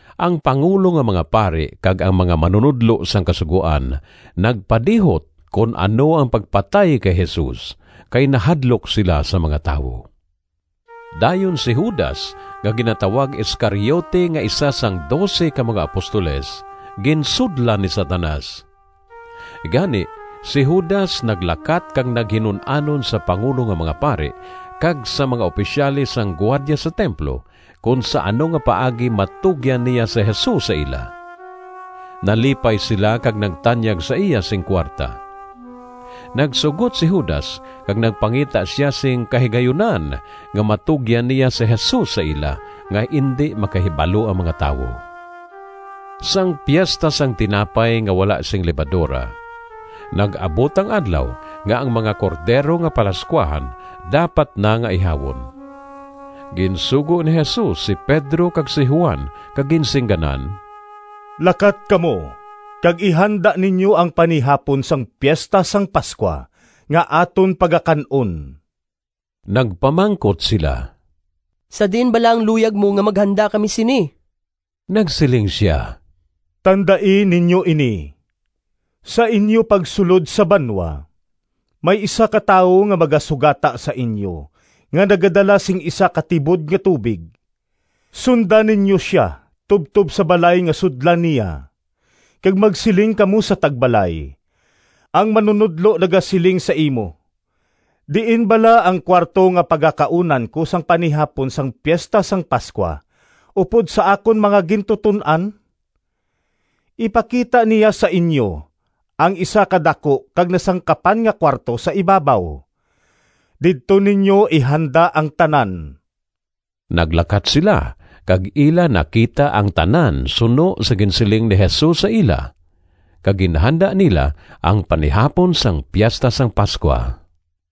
Ang pangulo nga mga pari kag ang mga manunodlo sang Kasugoan nagpadihot kon ano ang pagpatay kay Jesus, kay nahadlok sila sa mga tawo. Dayon si Judas nga ginatawag Iscariote nga isa sang dose ka mga apostoles, ginsudlan ni Satanas. Gani, si Judas naglakat kag naghinun-anon sa pangulo nga mga pari kag sa mga opisyales sang gwardya sa templo kon sa ano nga paagi matugyan niya si Jesus sa ila. Nalipay sila kag nagtanyag sa iya sing kuwarta. Nagsugot si Judas kag nagpangita sia sing kahigayunan nga matugyan niya si Jesus sa ila nga indi makahibalo ang mga tawo. Sang Piesta sang Tinapay nga wala sing Lebadora, nag-abot ang adlaw nga ang mga cordero nga palascuahan dapat na nga ihawon. Ginsugo ni Jesus si Pedro kag si Juan kag ginsingganan, “Lakat kamo kag ihanda ninyo ang panihapon sang Piesta sang Pascua nga aton pagakan-on.” Nagpamangkot sila, “Sa diin bala ang luyag mo nga maghanda kami sini?” Nagsiling sia, “Tandai ninyo ini! Sa inyo pagsulod sa banwa, may isa ka tawo nga magasugata sa inyo nga nagadala sing isa ka tibod nga tubig. Sunda ninyo sia tubtob sa balay nga sudlan niya, kag magsiling kamo sa tagbalay, ‘Ang Manunodlo nagasiling sa imo, Diin bala ang kuwarto nga pagakaunan ko sang panihapon sang Piesta sang Pascua upod sa akon mga gintuton-an?’ Ipakita niya sa inyo ang isa ka daku kag nasangkapan nga kuwarto sa ibabaw. Didto ninyo ihanda ang tanan.” Naglakat sila kag ila nakita ang tanan suno sa ginsiling ni Jesus sa ila, kag ginhanda nila ang panihapon sang Piesta sang Pascua.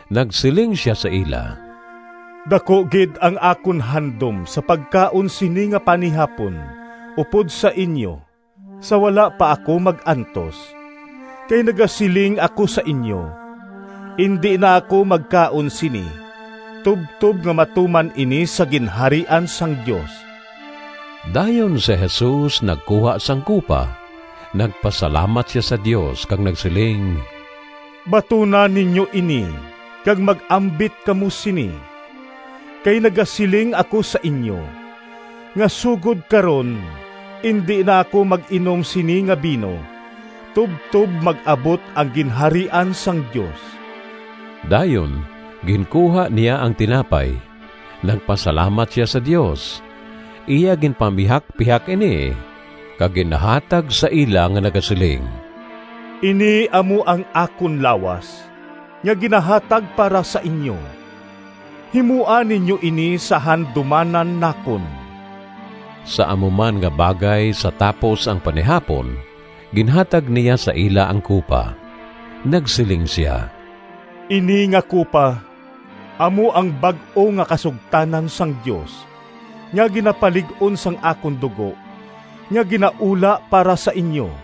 Nagsiling sia sa ila, “Daku gid ang akon handom sa pagkaon sini nga panihapon upod sa inyo sa wala pa ako mag-antos. Kay nagasiling ako sa inyo, indi na ako magkaon sini tubtob nga matuman ini sa Ginharian sang Dios.” Dayon si Jesus nagkuha sang kupa, nagpasalamat sia sa Dios kag nagsiling, “Batuna ninyo ini kag mag-ambit kamo sini. Kay nagasiling ako sa inyo, nga sugod karon indi na ako mag-inom sini nga bino tubtob mag-abot ang Ginharian sang Dios.” Dayon ginkuha niya ang tinapay, nagpasalamat sia sa Dios, iya ginpamihakpihak ini, kag ginhatag sa ila nga nagasiling, “Ini amo ang akon lawas [nga ginahatag para sa inyo. Himoa ninyo ini sa handumanan nakon.” Sa amo man nga bagay sa tapos ang panihapon ginhatag niya sa ila ang kupa. Nagsiling sia, “Ini nga kupa amo ang bag-o nga kasugtanan sang Dios nga ginapalig-on sang akon dugo nga ginaula para sa inyo.]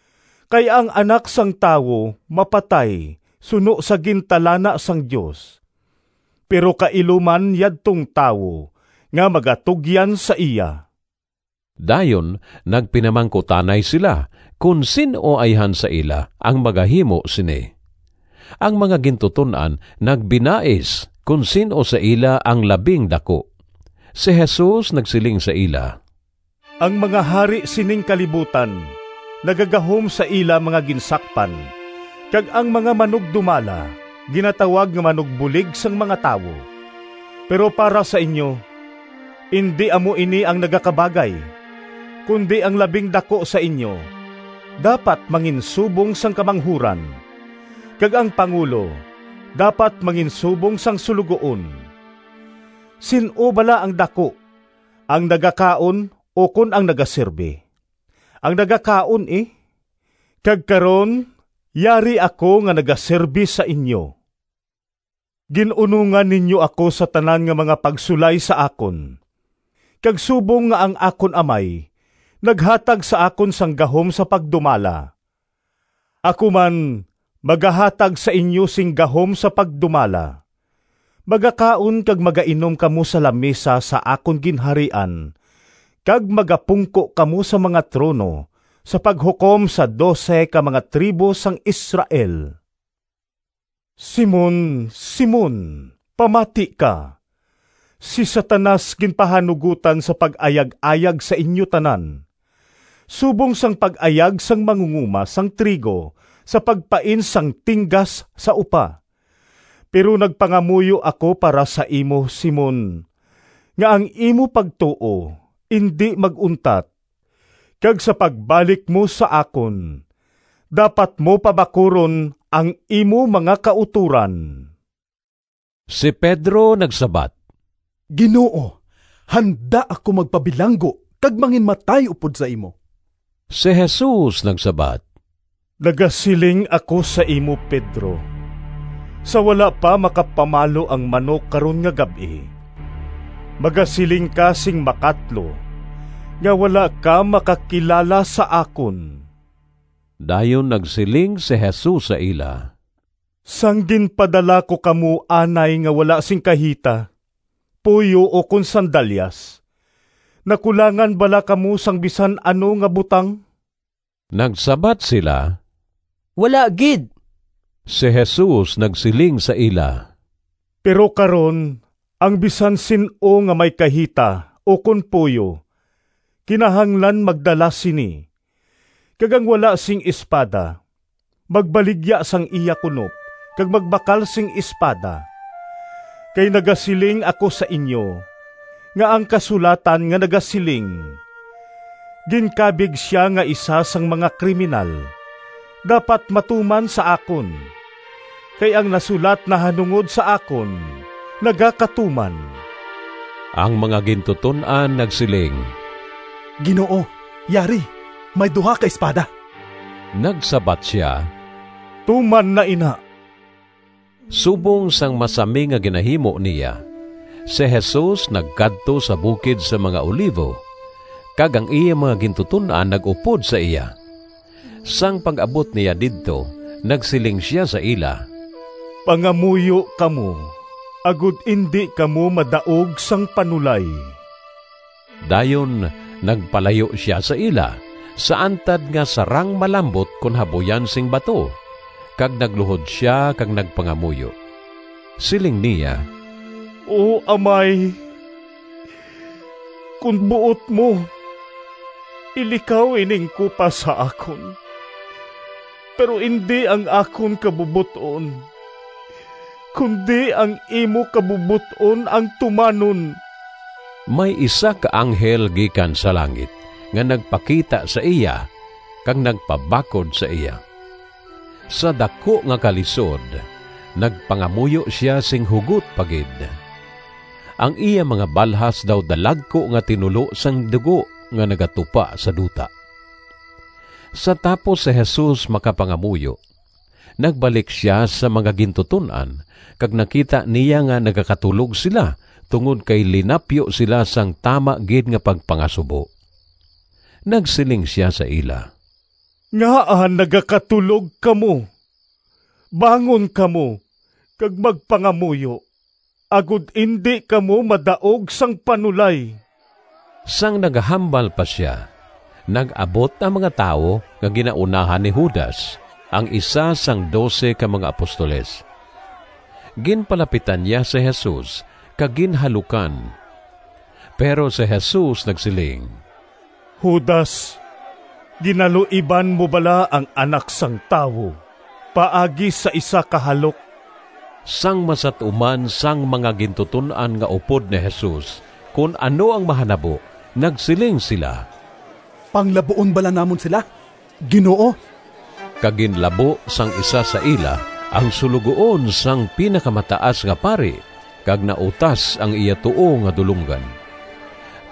Kay ang Anak sang Tawo mapatay suno sa gintalana sang Dios, pero kailo man yadtong tawo nga magatugyan sa iya.” Dayon nagpinamangkutanay sila kon sin-o ayhan sa ila ang magahimo sini. Ang mga gintuton-an nagbinais kon sin-o sa ila ang labing daku. Si Jesus nagsiling sa ila, “Ang mga hari sining kalibutan nagagahom sa ila mga ginsakpan kag ang mga manugdumala ginatawag nga ‘Manugbulig sang mga Tawo.’ Pero para sa inyo indi amo ini ang nagakabagay, kundi ang labing daku sa inyo dapat manginsubong sang kamanghuran, kag ang pangulo dapat manginsubong sang suloguon. Sin-o bala ang daku, ang nagakaon ukon ang nagasirbe? Ang nagakaon, e. Kag karon, yari ako nga nagasirbe sa inyo. “Gin-unongan ninyo ako sa tanan nga mga pagsulay sa akon, kag subong nga ang akon Amay naghatag sa akon sang gahom sa pagdumala, ako man magahatag sa inyo sing gahom sa pagdumala. Magakaon kag magainom kamo sa lamisa sa akon Ginharian kag magapungko kamo sa mga trono sa paghukom sa dose ka mga tribo sang Israel.” “Simon, Simon, pamati ka! Si Satanas ginpahanugotan sa pag-ayag-ayag sa inyo tanan, subong sang pag-ayag sang mangungoma sang trigo sa pagpain sang tinggas sa upa. Pero nagpangamuyo ako para sa imo, Simon, nga ang imo pagtuo indi mag-untat. Kag sa pagbalik mo sa akon, dapat mo pabakuron ang imo mga kautoran.” Si Pedro nagsabat, “Ginoo, handa ako magpabilanggo kag manginmatay upod sa imo.” Si Jesus nagsabat, “Nagasiling ako sa imo, Pedro, sa wala pa makapamalo ang manok karon nga gab-i, magasiling ka sing makatlo nga wala ka makakilala sa akon.” Dayon nagsiling si Jesus sa ila, “Sang ginpadala ko kamo anay nga wala sing kahita, puyo ukon sandalyas, nakulangan bala kamo sang bisan ano nga butang?” Nagsabat sila, “Wala gid.” Si Jesus nagsiling sa ila, “Pero karon, ang bisan sin-o nga may kahita ukon puyo kinahanglan magdala sini, kag ang wala sing espada magbaligya sang iya kunop kag magbakal sing espada. Kay nagasiling ako sa inyo nga ang kasulatan nga nagasiling, ‘Ginkabig sia nga isa sang mga kriminal,’ dapat matuman sa akon. Kay ang nasulat nahanungod sa akon nagakatuman.” Ang mga gintuton-an nagsiling, “Ginoo, yari may duha ka espada!” Nagsabat sia, “Tuman na ina!” Subong sang masami nga ginahimo niya, si Jesus nagkadto sa bukid sang mga Olivo, kag ang iya mga gintuton-an nag-upod sa iya. Sang pag-abot niya didto nagsiling sia sa ila, “Pangamuyo kamo agod indi kamo madaog sang panulay.” Dayon nagpalayo sia sa ila sa antad nga sarang malambot kon habuyan sing bato, kag nagluhod sia kag nagpangamuyo. Siling niya, “O amay, kon buot mo, ilikaw ining kupa sa akon. Pero indi ang akon kabubot-on, kundi ang imo kabubot-on ang tumanon.” [ May isa ka anghel gikan sa langit nga nagpakita sa iya kag nagpabakod sa iya. Sa daku nga kalisod nagpangamuyo sia sing hugot pa gid. Ang iya mga balhas daw dalagku nga tinulo sang dugo nga nagatupa sa duta.] Sa tapos si Jesus makapangamuyo nagbalik sia sa mga gintuton-an kag nakita niya nga nagakatulog sila tungod kay linapyo sila sang tama gid nga pagpangasubo. Nagsiling sia sa ila, “Ngaa nagakatulog kamo? Bangon kamo kag magpangamuyo agod indi kamo madaog sang panulay.” Sang nagahambal pa sia nag-abot ang mga tawo nga ginaunahan ni Judas, ang isa sang dose ka mga apostoles. Ginpalapitan niya si Jesus kag ginhalukan. Pero si Jesus nagsiling, “Judas, ginaluiban mo bala ang Anak sang Tawo paagi sa isa ka halok?” Sang masat-uman sang mga gintuton-an nga upod ni Jesus kon ano ang mahanabo nagsiling sila, “Panglabuon bala namon sila, Ginoo?” Kag ginlabo sang isa sa ila ang suloguon sang Pinakamataas nga Pari kag nautas ang iya tuo nga dulonggan.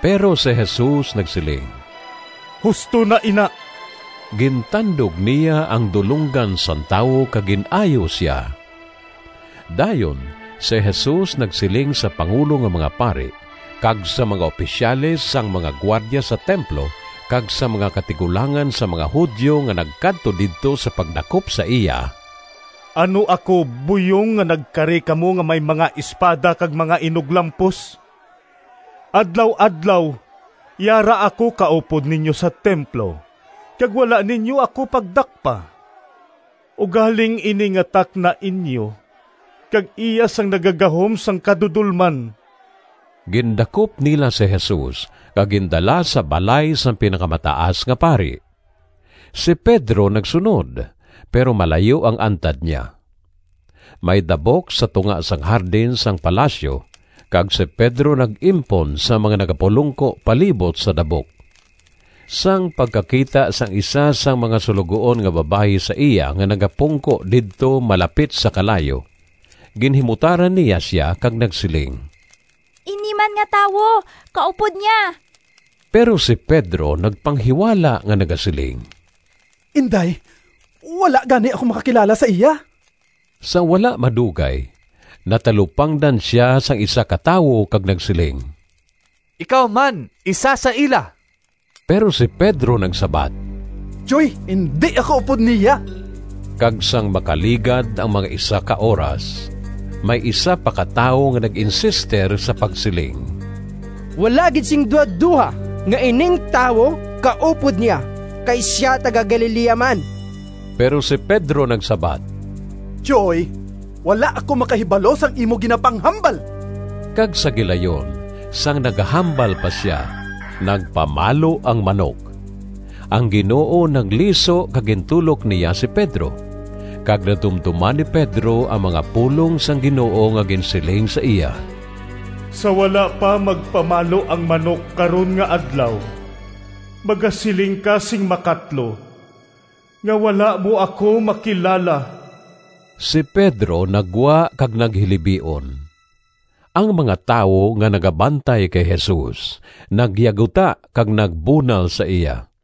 Pero si Jesus nagsiling, “Husto na ina!” Gintandog niya ang dulonggan sang tawo kag gin-ayo sia. Dayon si Jesus nagsiling sa pangulo nga mga pari kag sa mga opisyales sang mga gwardya sa templo kag sa mga katigulangan sang mga Judio nga nagkadto didto sa pagdakop sa iya, “Ano ako buyong nga nagkari kamo nga may mga espada kag mga inuglampos? Adlaw-adlaw yara ako kaupod ninyo sa templo kag wala ninyo ako pagdakpa. Ugaling ini nga takna inyo kag iya sang nagagahom sang kadudolman.” Gindakop nila si Jesus kag gindala sa balay sang Pinakamataas nga Pari. Si Pedro nagsunod, pero malayo ang antad niya. May dabok sa tunga sang hardin sang palasyo kag si Pedro nag-impon sa mga nagapulongko palibot sa dabok. Sang pagkakita sang isa sang mga suloguon nga babayi sa iya nga nagapungko didto malapit sa kalayo, ginhimutaran niya sia kag nagsiling, “Ini man nga tawo kaupod niya.” Pero si Pedro nagpanghiwala nga nagasiling, “Inday, wala gani ako makakilala sa iya.” Sa wala madugay natalupangdan sia sang isa ka tawo, kag nagsiling, “Ikaw man isa sa ila.” Pero si Pedro nagsabat, “Tyoy, indi ako upod niya.” Kag sang makaligad ang mga isa ka oras, may isa pa ka tawo nga nag-insister sa pagsiling, “Wala gid sing duhadoha nga ining tawo kaupod niya kay sia taga-Galilea man.” Pero si Pedro nagsabat, “Tyoy, wala ako makahibalo sang imo ginapanghambal.” Kag sa gilayon, sang nagahambal pa sia, nagpamalo ang manok. Ang Ginoo nagliso kag gintulok niya si Pedro, kag nadumdoman ni Pedro ang mga pulong sang Ginoo nga ginsiling sa iya, “Sa wala pa magpamalo ang manok karon nga adlaw, magasiling ka sing makatlo nga wala mo ako makilala.” Si Pedro naggwa kag naghilibion. Ang mga tawo nga nagabantay kay Jesus nagyaguta kag nagbunal sa iya.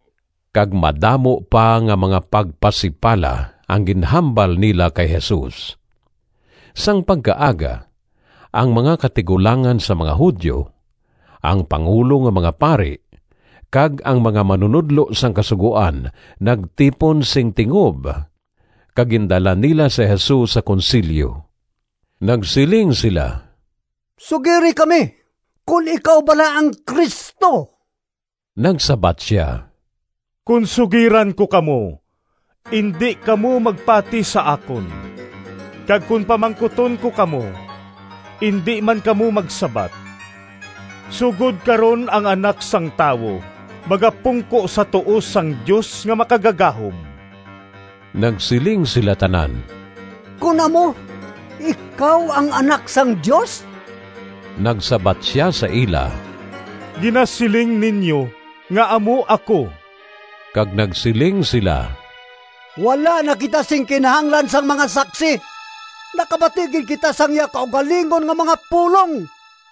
Kag madamo pa nga mga pagpasipala ang ginhambal nila kay Jesus. Sang pagkaaga, ang mga katigulangan sang mga Judio, ang pangulo nga mga pari, kag ang mga manunodlo sang Kasugoan nagtipon sing tingob, kag gindala nila si Jesus sa Konsilyo. Nagsiling sila, “Sugiri kami kon ikaw bala ang Cristo?” Nagsabat sia, “Kon sugiran ko kamo, indi kamo magpati sa akon, kag kon pamangkuton ko kamo, indi man kamo magsabat. Sugod karon ang Anak sang Tawo magapungko sa tuo sang Dios nga Makagagahom.” Nagsiling sila tanan, “Kon amo, ikaw ang Anak sang Dios?” Nagsabat sia sa ila, “Ginasiling ninyo nga amo ako.” Kag nagsiling sila, “Wala na kita sing kinahanglan sang mga saksi! Nakabati gid kita sang iya kaugalingon nga mga pulong.”